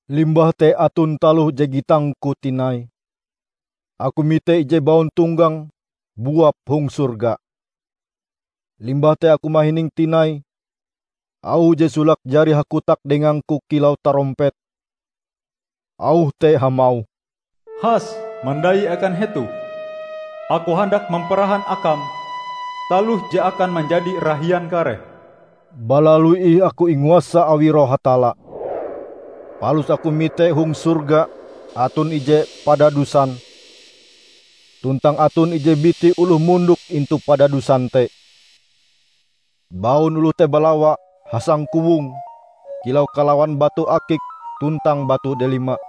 Limbah te aton taloh je gitangku tinai. Aku mite ije bauntonggang buap hong sorga. Limbah te aku mahining tinai auh je solake jari hakotak dengangku kilau tarompet. Auh te hamauh, "Has, mandai akan hetoh. Aku handak mamparahan akam taloh je akan manjadi rahian kareh." Balalu ih aku inguasa awi Roh Hatalla. Palus aku mite hong sorga aton ije padadusan, tuntang aton ije biti oloh mondok intu padadusan te. Baun oloh te balawa hasangkowong kilau kalawan batu akik tuntang batu delima.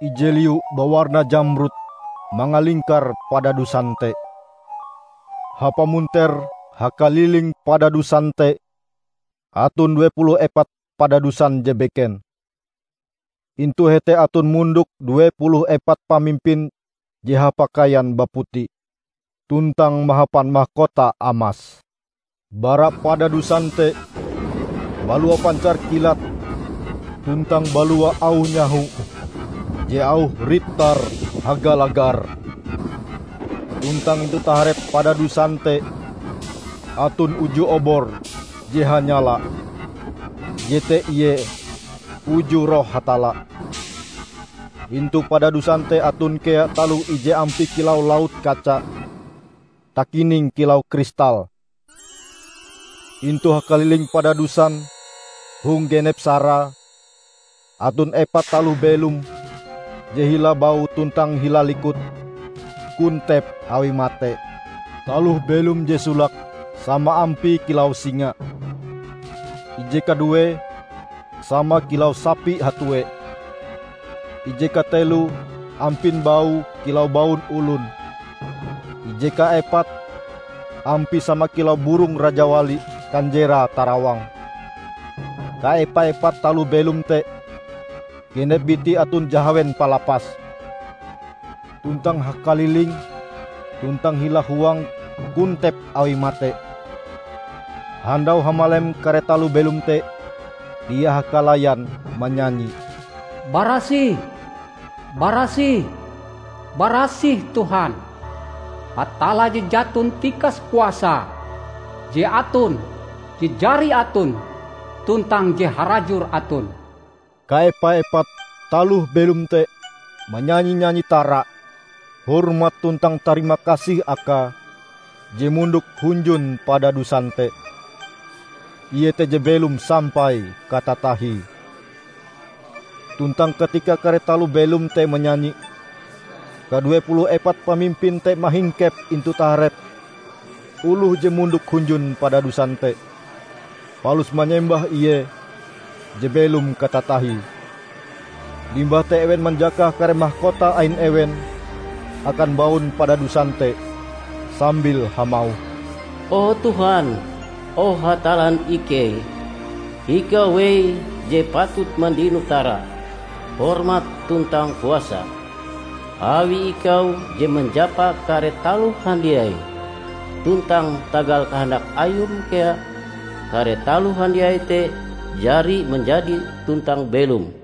Ije liu bawarna jamrud mangalingkar padadusan te. Hapamunter hakaliling padadusan te aton due puluh epat padadusan je beken. Intu hete aton mondok due puluh epat pamimpin je hapakaian baputi, tuntang mahapan makota amas. Bara padadusan te balua pancar kilat tuntang balua auh nyaho je auhe rit-tar hagalagar. Tuntang intu taharep padadusan te aton uju obor je hanyala; jete ie uju Roh Hatalla. Intu padadusan te aton kea taloh ije ampie kilau laut kaca, takining kilau kristal. Intu hakaliling padadusan, hong genep sarae, aton epat taloh belom je hila baue tuntang hila likute kontep awi mate. Taloh belom je solake sama ampie kilau singa. Ije kaduee, sama kilau sapi hatuee. Ije kateloe ampin baue kilau baun olon. Ije kaepate, ampie sama kilau burong rajawali kanjerae tarawang. Kaepa-epat taloh belom te, genep bitie aton jahawen palapase, tuntang hakalilinge tuntang hila huange kontep awi mate. Handau hamalem kare taloh belom te dia hakalayan manyanyi, "Barasih, barasih, barasih Tuhan, Hatalla Je Jaton Tikas Kuasae; je aton, je jari aton, tuntang je harajur aton." Kaepa-epat taloh belom te manyanyi nyanyi tara, hormat tuntang tarima kasih Akae je mondok hunjun padadusan te, Ie te je belom sampai katatahie. Tuntang katika kare taloh belom te manyanyi, kadue puluh epat pamimpin te mahingkep intu taharep oloh je mondok hunjun padadusan te, palus manyembah Ie je belom katatahie. Limbah te ewen manjakah kare makota ain ewen akan baun padadusan te sambil hamauh, "O Tuhan, o Hatallan ikei! Ikau wei je patut mandino tara, hormat tuntang kuasa. Awi ikau je manjapa kare taloh handiai, tuntang tagal kahandak Ayum kea kare taloh handiai te jari manjadi tuntang belom."